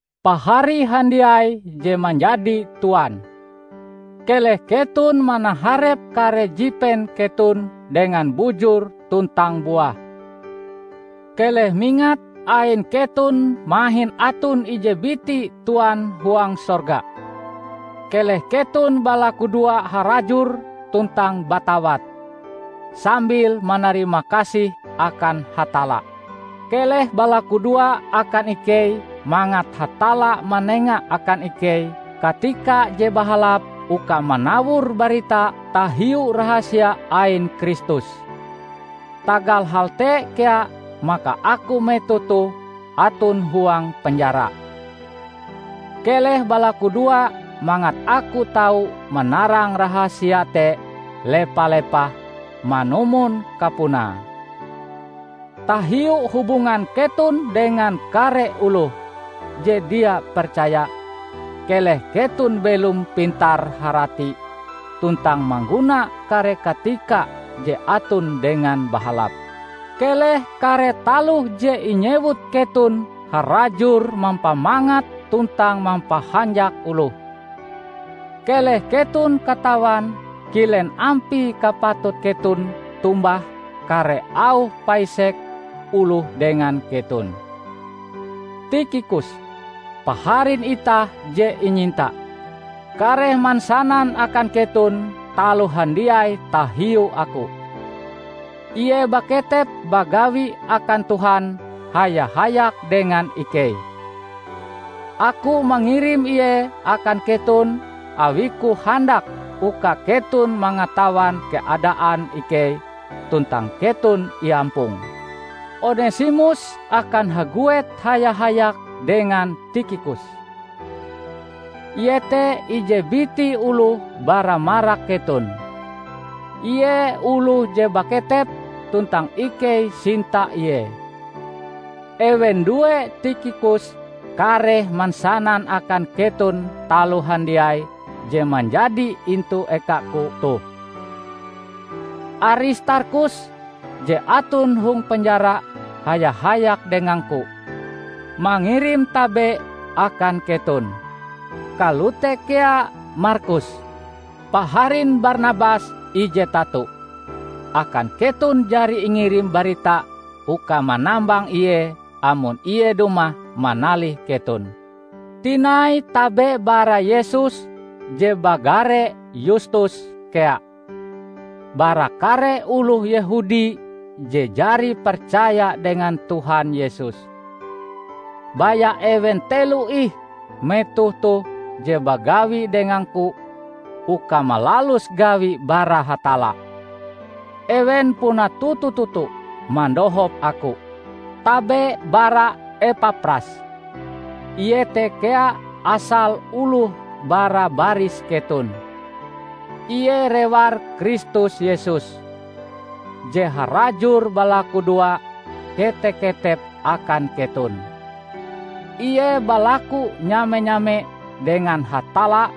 Pahari handiai je manjadi tuan! Keleh keton manaharep kare jipen keton dengan bujur tuntang buah. Keleh mingat, ain keton mahin aton ije biti Tuan huang sorga. Keleh keton balakudoa harajur tuntang batawat, sambil manarimakasih akan Hatalla. Keleh balakudoa akan ikei mangat Hatalla manenga akan ikei katika je bahalap uka manawor barita tahiu rahasia ain Kristus. Tagal hal te kea maka aku metoh toh aton huang penjara. Keleh balakudoa mangat aku tau manarang rahasia te lepa-lepah manumon kapunae. Tahiu hubungan keton dengan kare oloh je dia percaya, keleh keton belom pintar-harati tuntang mangguna kare katika je aton dengan bahalap. Keleh kare taloh je inyewut keton harajur mampamangat tuntang mampahanjak oloh. Keleh keton katawan kilen ampie kapatut keton tombah kare auh paisek oloh dengan keton. Tikhikus, paharin itah je inyinta, kareh mansanan akan keton taloh handiai tahiu aku. Ie baketep bagawi akan Tuhan haya-hayak dengan ikei. Aku mangirim ie akan keton awiku handak uka keton mangatawan keadaan ikei tuntang keton iampong. Onesimus akan haguet haya-hayak dengan Tikhikus; ie te ije biti oloh bara marak keton. Ie oloh je baketep tuntang ikei sinta ie. Ewen due Tikhikus kareh mansanan akan keton taloh handiai je manjadi intu ekaku toh. Aristarkhus, je aton hong penjara haya-hayak dengangku, mangirim tabe akan keton. Kalote kea Markus, paharin Barnabas ije tato. (Akan keton jari ingirim barita uka manambang ie amon ie dumah manalih keton.) Tinai tabe bara Yesus je bagare Yustus kea. Bara kare oloh Yehudi je jari percaya dengan Tuhan Yesus, baya ewen telo ih metoh toh je bagawi dengangku uka malalus gawi bara Hatalla. Ewen puna toto-toto mandohop aku. Tabe bara Epapras. Ie te kea asale oloh bara baris keton. Ie rewar Kristus Yesus, je harajur balakudoa kete-ketep akan keton. Ie balaku nyame-nyame dengan Hatalla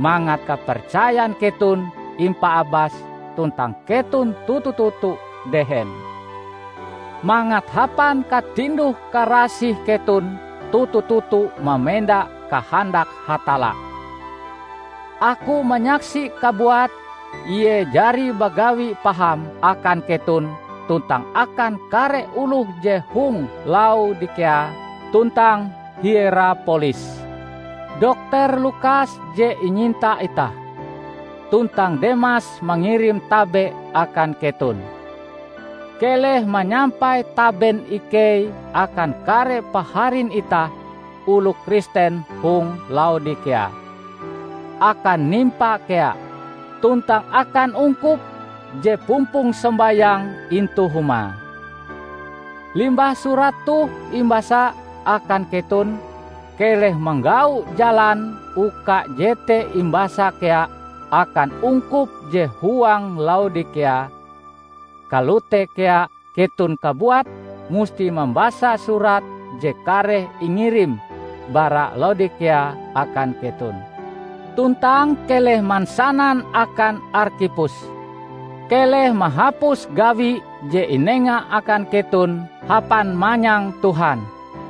mangat kapercayan keton impaabas tuntang keton toto-toto dehen, mangat hapan katinduh-karasih keton toto-toto mamenda kahandak Hatalla. Aku manyaksi kabuat ie jari bagawi paham akan keton tuntang akan kare oloh je hong Laodikea tuntang Hierapolis. Dokter Lukas je inyinta itah, tuntang Demas mangirim tabe akan keton. Keleh manyampai taben ikei akan kare paharin itah oloh Kristen hong Laodikea; akan Nimpa kea, tuntang akan ungkup je pumpong sombayang intu humae. Limbah surat toh imbasa akan keton, keleh manggau jalan uka jete imbasa kea akan ungkup je huang Laodikea, kalote kea keton kabuat musti mambasa surat je kareh ingirim bara Laodikea akan keton. Tuntang keleh mansanan akan Arkhipus, "Keleh mahapus gawi je inenga akan keton hapan manyang Tuhan."